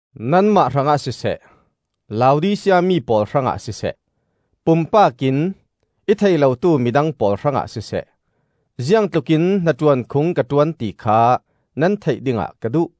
Nanmah hrangah siseh, Laodisia mi pawl hrangah siseh, pumpak in i thei lotu midang pawl hrangah siseh, ziangtlukin hnaṭuan khung ka ṭuan ti kha nan theih dingah ka duh.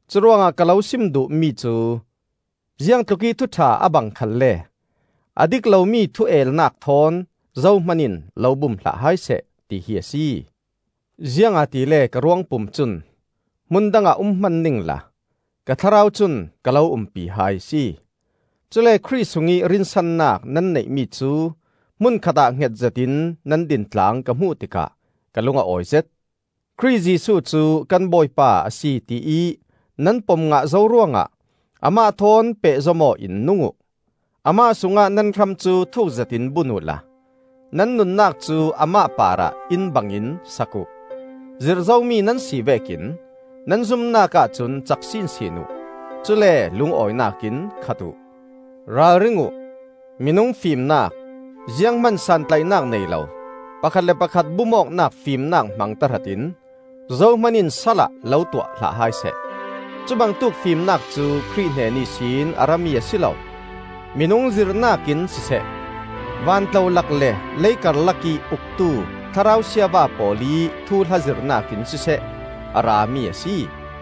Curuangah ka lo sim duh mi cu: ziangtlukih thuṭha a bang khalle, a dik lomi thu el-nak thawn zohman in lo bum hlah hai seh, tihi a si. Ziangahtile ka ruangpum cun hmun dangah um hman ningla ka thlarau cun ka lo umpi hai a si; cule Khrih sungih rinsannak nan neihmi cu hmun khatah hnget zetin nan dintlang ka hmuh tikah ka lung a awizet. Khrih Jesuh cu kan Bawipa a si tiih nan pom ngah zo ruangah amah thawn pehzom aw in nung uh. Amah sungah nan hram cu thuuk zetin bun uhla nan nunnak cu amah parah inn bangin sak uh; zirh zomi nan si vekin nan zumnak ahcun cak sinsin uh; cule lungawinak in khat uh. Ralring uh! Minung fimnak, zianghman santlaihnak nei lo, pakhat le pakhat bum awknak fimnak hmang tahratin zohman in sal ah lo tuah hlah hai seh. Cubangtuk fimnak cu Khrih hnen ihsin a rami a si lo; minung zirhnak in siseh, vantlolak le lei karlakih uktu thlarau siava pawl ih thuhla zirhnak in siseh, a rami a si.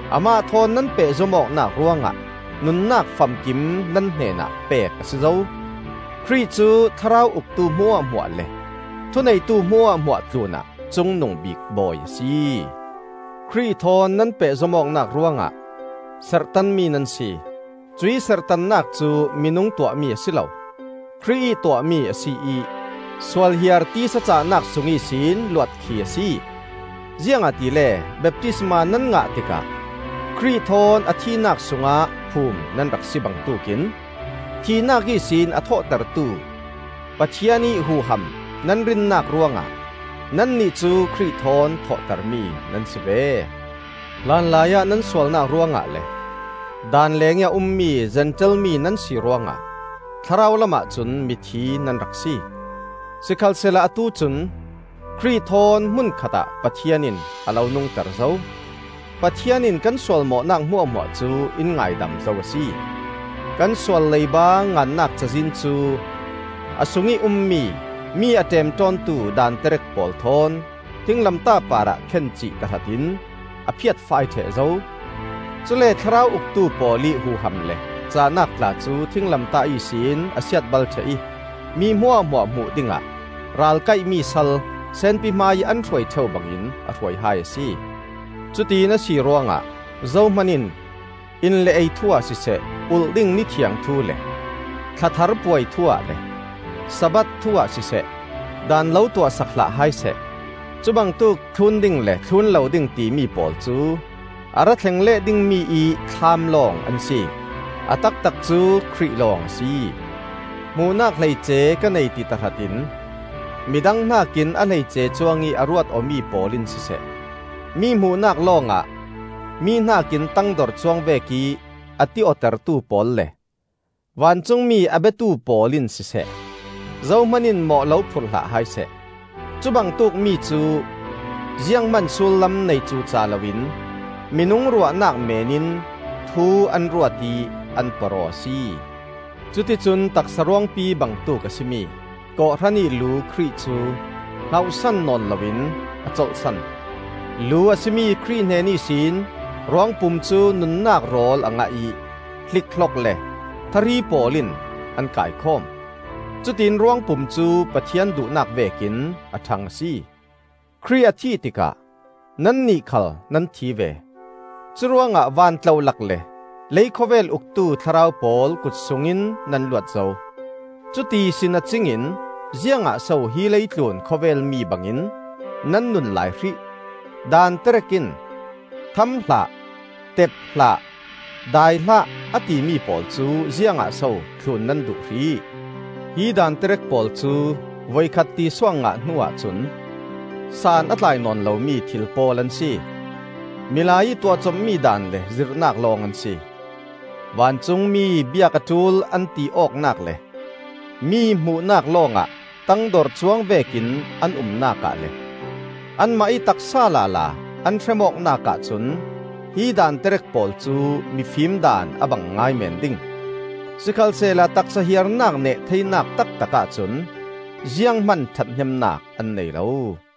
amah thawn nan pehzom awknak ruangah nunnak famkim nan hnenah pek a si zo. Khrih cu thlarau uktu hmuahhmuah le thuneitu hmuahhmuah tlunah cungnungbik Bawi a si. Khrih thawn nan pehzom awknak ruangah serhtanmi nan si; cuih serhtannak cu minung tuahmi a si lo, Khrih ih tuahmi a si ih sualhiar tisa cahnak sung ihsin luat khi a si. Ziangahtile baptisma nan ngah tikah Khrih thawn a thihnak sungah phum nan rak si bangtuk in thihnak ihsin a thawhtertu Pathian ih huham nan rinnak ruangah nannih cu Khrih thawn thawhtermi nan si ve. Hlanlaiah nan sualnak ruangah le Daan lengih a ummi Zentail mi nan si ruangah thlarau lamah cun mithi nan rak si. Sikhalsehla atu cun Khrih thawn hmun khatah Pathian in a lo nungter zo. Pathian in kan sualmawhnak hmuahhmuah cu in ngaidam zo a si. Kan sual leiba ngannak cazin cu a sungih ummi, mi a ṭemṭawntu daanterek pawl thawn thinglamtah parah khencih tahratin a phiatfai ṭheh zo. Cule thlarau uktu pawl ih huham le cahnak tla cu thinglamtah ihsin a siatbal ṭheh ih mi hmuahhmuah hmuh dingah ralkaih-mi sal senpi hmaiih an hruai ṭheu bangin a hruai hai a si. Cutin a si ruangah zohman in in le ei thu-ah siseh, ulh ding nithiang thu le thlathar puai thu-ah le Sabbath thu-ah siseh, daan lo tuahsak hlah hai seh. Cubangtuk thlun ding le thlun lo ding timi pawl cu a rathleng leh dingmi ih thlam lawng an si. A taktak cu Khrih lawng a si. Hmuhnak hleice ka nei ti tahratin midang hnakin a hleice cuangih a ruat awmi pawl in siseh, mi hmuhnak lawngah mi hnakin tangdor cuang vekih a ti awtertu pawl le vancungmi a biatu pawl in siseh, zohman in mawh lo phurh hlah hai seh. Cubangtuk mi cu zianghman sullam nei cuca loin minung ruahnak meen in thu an ruat ih an porh aw a si. Cuticun taksa ruangpi bangtuk a si mi kawhhran ih lu Khrih cu hngauhsan nawn loin a colhsan. Lu a si mi Khrih hnen ihsin ruangpum cu nunnak rawl a ngah ih hlikhlok le thahri pawl in an kaikhawm. Cutiin ruangpum cu Pathian duhnak vekin a ṭhang a si. Khrih a thih tikah nannih khal nan thi ve; curuangah vantlolak le leikhawvel uktu thlarau pawl kut sungin nan luat zo. Cuti si nacing in ziangah so hi leitlun khawvel mi bangin nan nun lai hrih? Daan terek in, “Tham hlah,” “Tep hlah,” “Dai hlah,” a timi pawl cu ziangah so thlun nan duh hrih? Hi daan terek pawl cu voikhat ti suak ngah hnuah cun san a tlai nawn lomi thil pawl an si. Milai ih tuahcopmi daan le zirhnak lawng an si. Vancungmi biak a ṭul an ti awknak le mi hmuhnak lawngah tangdor cuang vekin an umnak ah le anmah ih taksa lala an hrem awknak ahcun hi daan terek pawl cu mifim daan a bang ngai meen ding. Sikhalsehla taksa hiarnak neh theinak taktak ahcun zianghman ṭhathnemnak an nei lo.